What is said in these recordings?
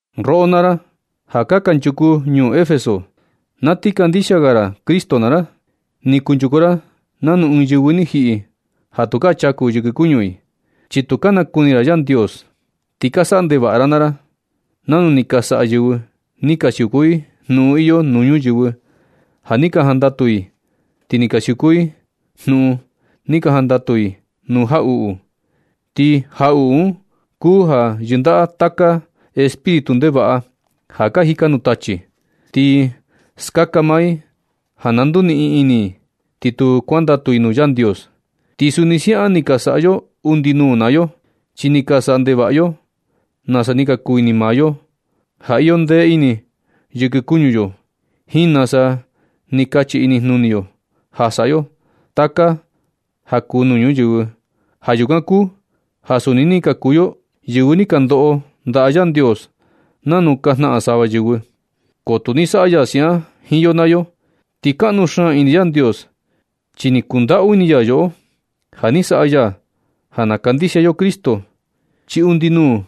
Roꞌo naa ra ja kanchuku ñuu Efeso, na ti kandixia ga ra Cristo naa ra, ni kunchuku ra nanu ɨɨn yɨvɨ ni jiꞌi ja tukaa chaku yɨkɨ kuñu i, chi tu ka nakuni ra Yandios. Ti ka saꞌa ndevaꞌa ra naa ra nanu ni ka saꞌa yɨvɨ ni ka siuku i jnuꞌun iyo nuu ñuyɨvɨ ja ni ka jandatu i ti ka ni siuku i jnuꞌun un. Ni ka jandatu i nuu jaꞌuꞌu, ti jaꞌuꞌu un kuu ja yɨndaꞌa taka espíritu ndevaꞌa ja ka jika nuu tachi. Ti skaka maa i ja na nduniꞌin ini i, ti tu kuandatu i nuu Yandios. Ti suni siaꞌan ni ka saꞌa yo undi nuu naa yo, chi ni ka saꞌa ndevaꞌa yo nasa ni ka kuu ini maa yo ja iyo ndee ini yɨkɨ kuñu yo, jiin nasa ni kachi inijnuni yo ja saꞌa yo taka ja kuu nuu ñuyɨvɨ. Ja yukan kuu ja suni ni ka kuu yo yɨvɨ ni ka ndoꞌo ndaꞌa Yandios nanu ka jnaꞌan sava yɨvɨ. Ko tu ni saꞌa ya siaꞌan jiin yo naa yo. Ti kaꞌnu xaan ini Yandios chi ni kundaꞌu ini ya yoꞌo. Ja ni saꞌa ya ja na kandixia yo Cristo, chi undi nuu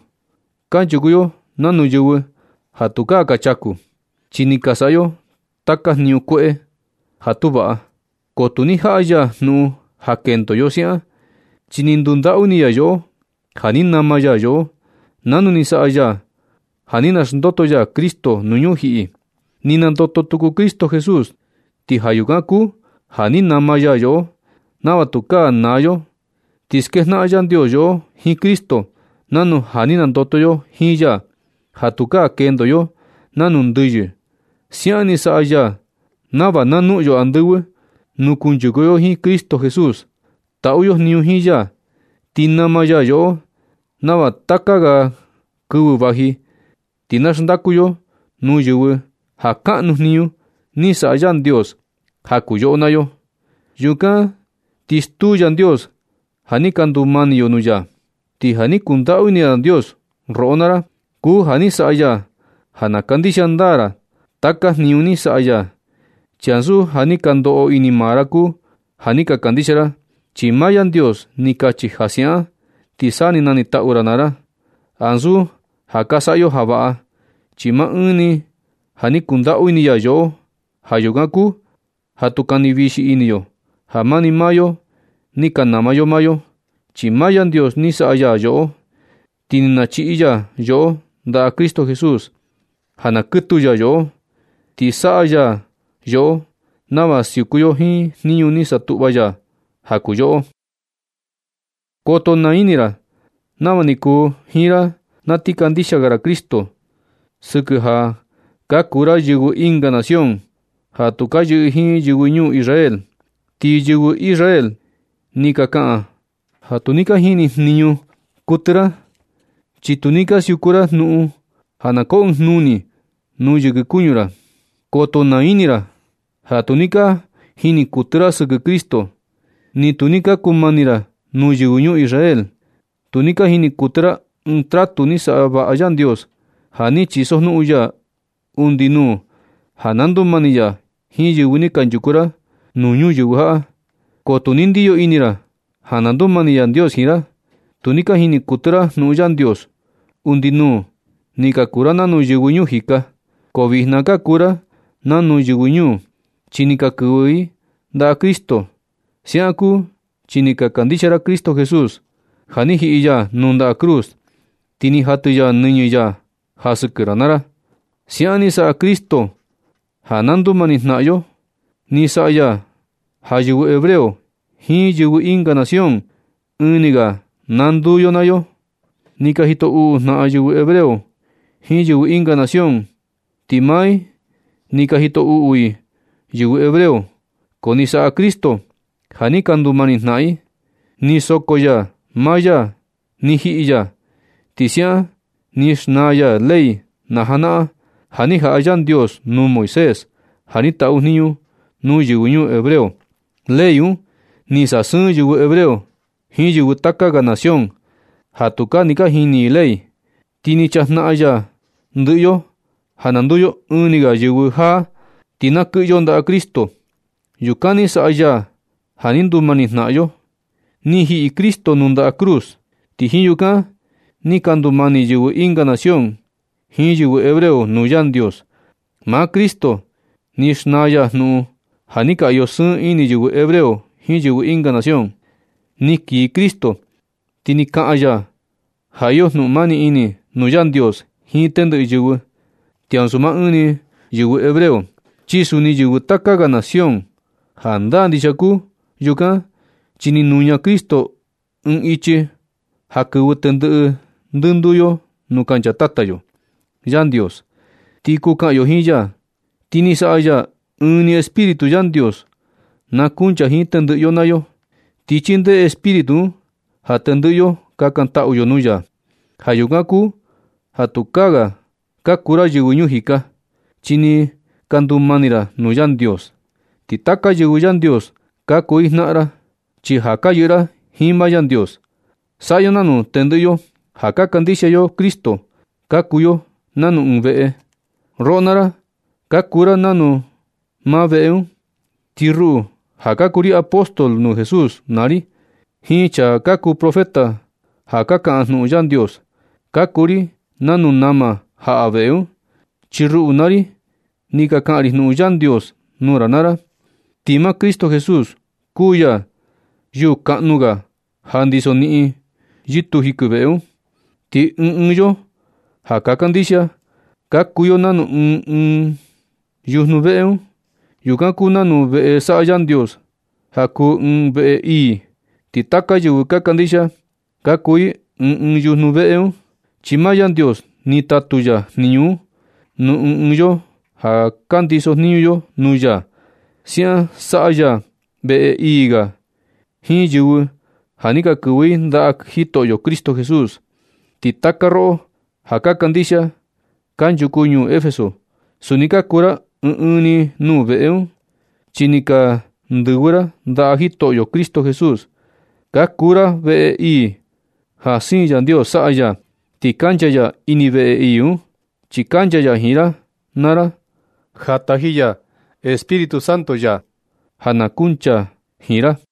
kanchuku yo nanu yɨvɨ ja tukaa ka chaku, chi ni ka saꞌa yo taka jniñu kueꞌe ja tu vaꞌa. Ko tu ni jaꞌa ya jnuꞌun ja kendo yo siaꞌan, chi ni ndundaꞌu ini ya yoꞌo ja ni nama ya yoꞌo, nanu ni saꞌa ya ja ni naxndoto ya Cristo nuu ñujiꞌi. Ni nandoto tuku Cristo Jesús. Ti ja yukan kuu ja ni nama ya yoꞌo nava tukaa naa yo. Ni skejnaꞌan Yandios yoꞌo jiin Cristo nanu ja ni nandoto yo jiin ya, ja tukaa kendo yo nanu ndɨyɨ. Siaꞌan ni saꞌa ya nava na noꞌon yo andɨvɨ nuu kuchaku yo jiin Cristo Jesús, taꞌu yo jniñu jiin ya. Ni nama ya yoꞌo nava taka ga kɨvɨ vaji ti na xndaku yo nuu yɨvɨ ja kaꞌnu jniñu ni saꞌa Yandios ja kuu yoꞌo naa yo. Yukan ti stuu Yandios ja ni ka ndumani yo nuu ya. Ti ja ni kundaꞌu ini Yandios roꞌo naa ra kuu ja ni saꞌa ya ja na kandixia ndaa ra taka jniñu ni saꞌa ya. Chi ansu ja ni ka ndoꞌo ini maa ra kuu ja ni ka kandixia ra, chi maa Yandios ni kachi ja siaꞌan ti sa nanitaꞌu ra naa ra. Ansu ja ka saꞌa yo ja vaꞌa, chi maa ɨɨn ni ja ni kundaꞌu ini ya yoꞌo. Ja yukan kuu ja tu kani vixi ini yo ja mani maa yo ni ka nama yo maa yo. Chi maa Yandios ni saꞌa ya yoꞌo, ti ni nachiꞌi ya yoꞌo ndaꞌa Cristo Jesús ja na kɨtu ya yoꞌo. Ni saꞌa ya yoꞌo nava na siuku yo jiin jniñu ni satuꞌva ya ja kuu yoꞌo. Koto naa ini ra nava ni kuu jiin ra na ti kandixia ga ra Cristo. Sɨkɨ ja ka kuu ra yɨvɨ ɨnga nación ja tu ka yɨꞌɨ jiin yɨvɨ ñuu Israel, ti yɨvɨ Israel ni ka kaꞌan ja tu ni ka jini jniñu kuɨtɨ ra, chi tu ni ka siuku ra jnuꞌun ja na koo ɨɨn jnuni nuu yɨkɨ kuñu ra. Koto naa ini ra ja tu ni ka jini kuɨtɨ ra sɨkɨ Cristo. Ni tu ni ka kuu mani ra nuu yɨvɨ ñuu Israel. Tu ni ka jini kuɨtɨ ra ɨɨn tratu ni saꞌa vaꞌa Yandios, ja ni chisojnuꞌun ya undi nuu ja na ndumani ya jiin yɨvɨ. Ni kunchuku ra nuu ñuyɨvɨ jaꞌa, ko tu ni ndiyo ini ra ja na ndumani Yandios jiin ra. Tu ni ka jini kuɨtɨ ra jnuꞌun Yandios. Undi nuu ni ka kuu ra nanu yɨvɨ ñuu jika. Ko vijna ka kuu ra nanu yɨvɨ ñuu, chi ni ka kɨvɨ i ndaꞌa Cristo. Siaꞌan kuu chi ni ka kandixia ra Cristo Jesús, ja ni jiꞌi ya nuu ndaꞌa cruz, ti ni jatɨ ya nɨñɨ ya ja sɨkɨ ra naa ra. Siaꞌan ni saꞌa Cristo ja na ndumani jnaꞌan yo. Ni saꞌa ya ja yɨvɨ hebreo jiin yɨvɨ ɨnga nación, ɨɨn ni ga na nduu yo nuu ya. Ni ka jito uꞌu jnaꞌan yɨvɨ hebreo jiin yɨvɨ ɨnga nación, ti maa i ni ka jito uꞌu i yɨvɨ hebreo, ko ni saꞌa Cristo ja ni ka ndumani jnaꞌan i. Ni soko ya maa ya, ni jiꞌi ya, ti siaꞌan ni xnaa ya ley najanaꞌan ja ni jaꞌa Yandios nuu Moisés ja ni taꞌu jniñu nuu yɨvɨ ñuu hebreo. Ley un ni sasɨɨn yɨvɨ hebreo jiin yɨvɨ taka ga nación ja tu ni ka jini i ley. Ti ni na chajnaꞌan ya ndɨꞌɨ yo ja na nduu yo ɨɨn ni ga yɨvɨ jaa, ti na kɨꞌɨ yo ndaꞌa Cristo. Yukan ni saꞌa ya ja ni ndumani jnaꞌan yo. Ni jiꞌi Cristo nuu ndaꞌa cruz. Ti jiin yukan ni ka ndumani yɨvɨ ɨnga nación jiin yɨvɨ hebreo nuu Yandios. Maa Cristo ni xnaa ya jnuꞌun ja ni ka iyo sɨɨn ini yɨvɨ hebreo jiin yɨvɨ ɨnga nación. Ni kii Cristo, ti ni kaꞌan ya ja iyo jnuꞌun mani ini nuu Yandios jiin tendɨꞌɨ yɨvɨ, ti ansu maa ɨɨn ni yɨvɨ hebreo, chi suni yɨvɨ taka ga nación. Jandaa ndixia kuu yukan chi ni nuña Cristo ɨɨn ichi ja kɨvɨ tendɨꞌɨ ndɨnduu yo nuu kancha Tata yo Yandios, ti kuu kaꞌan yo jiin ya. Ti ni saꞌa ya ja ɨɨn ni Espíritu Yandios na kuncha jiin tendɨꞌɨ yo naa yo, ti chindee Espíritu un ja tendɨꞌɨ yo kakantaꞌu yo nuu ya. Ja yukan kuu ja tukaa ga ka kuu ra yɨvɨ ñuu jika, chi ni ka ndumani ra nuu Yandios. Ti taka yɨvɨ Yandios ka kuu i jnaꞌan ra, chi ja ka yɨꞌɨ ra jiin maa Yandios. Saꞌa yo nanu. Tendɨꞌɨ yo ja ka kandixia yo Cristo, ka kuu yo nanu ɨɨn veꞌe. Roꞌo naa ra ka kuu ra nanu maa veꞌe un, ti ruꞌu ja ka kuu ri apóstol nuu Jesús naa ri, jiin chaa ka kuu profeta ja ka kaꞌan jnuꞌun Yandios, ka kuu ri nanu nama jaꞌa veꞌe un, chi ruꞌu naa ri ni ka kaꞌan ri jnuꞌun Yandios nuu ra naa ra. Ti maa Cristo Jesús kuu ya yuu kanuu ga ja ndiso niꞌin yɨtuu jikɨ veꞌe un. Ti ɨɨn ɨɨn yo ja ka kandixia, ka kuu yo nanu ɨɨn ɨɨn yujnu veꞌe un. Yukan kuu nanu veꞌe saꞌa Yandios ja kuu ɨɨn veꞌe ii, ti taka yɨvɨ ka kandixia ka kuu i ɨɨn ɨɨn yujnu veꞌe un, chi maa Yandios ni tatu ya jniñu un nuu ɨɨn ɨɨn yo ja ka ndiso jniñu yo nuu ya. Siaꞌan saꞌa ya veꞌe ii ga jiin yɨvɨ ja ni ka kɨvɨ i ndaꞌa Jitoꞌo Cristo Jesús. Ti taka roꞌo ja ka kandixia kanchuku ñuu Efeso, suni ka kuu ra ɨɨn ɨɨn nuu veꞌe un, chi ni ka ndɨvɨ ra ndaꞌa Jitoꞌo Cristo Jesús. Ka kuu ra veꞌe ii ja siin Yandios saꞌa ya. Ti kancha ya ini veꞌe ii un, chi kancha ya jiin ra naa ra ja taji ya Espíritu Santo ya ja na kuncha jiin ra.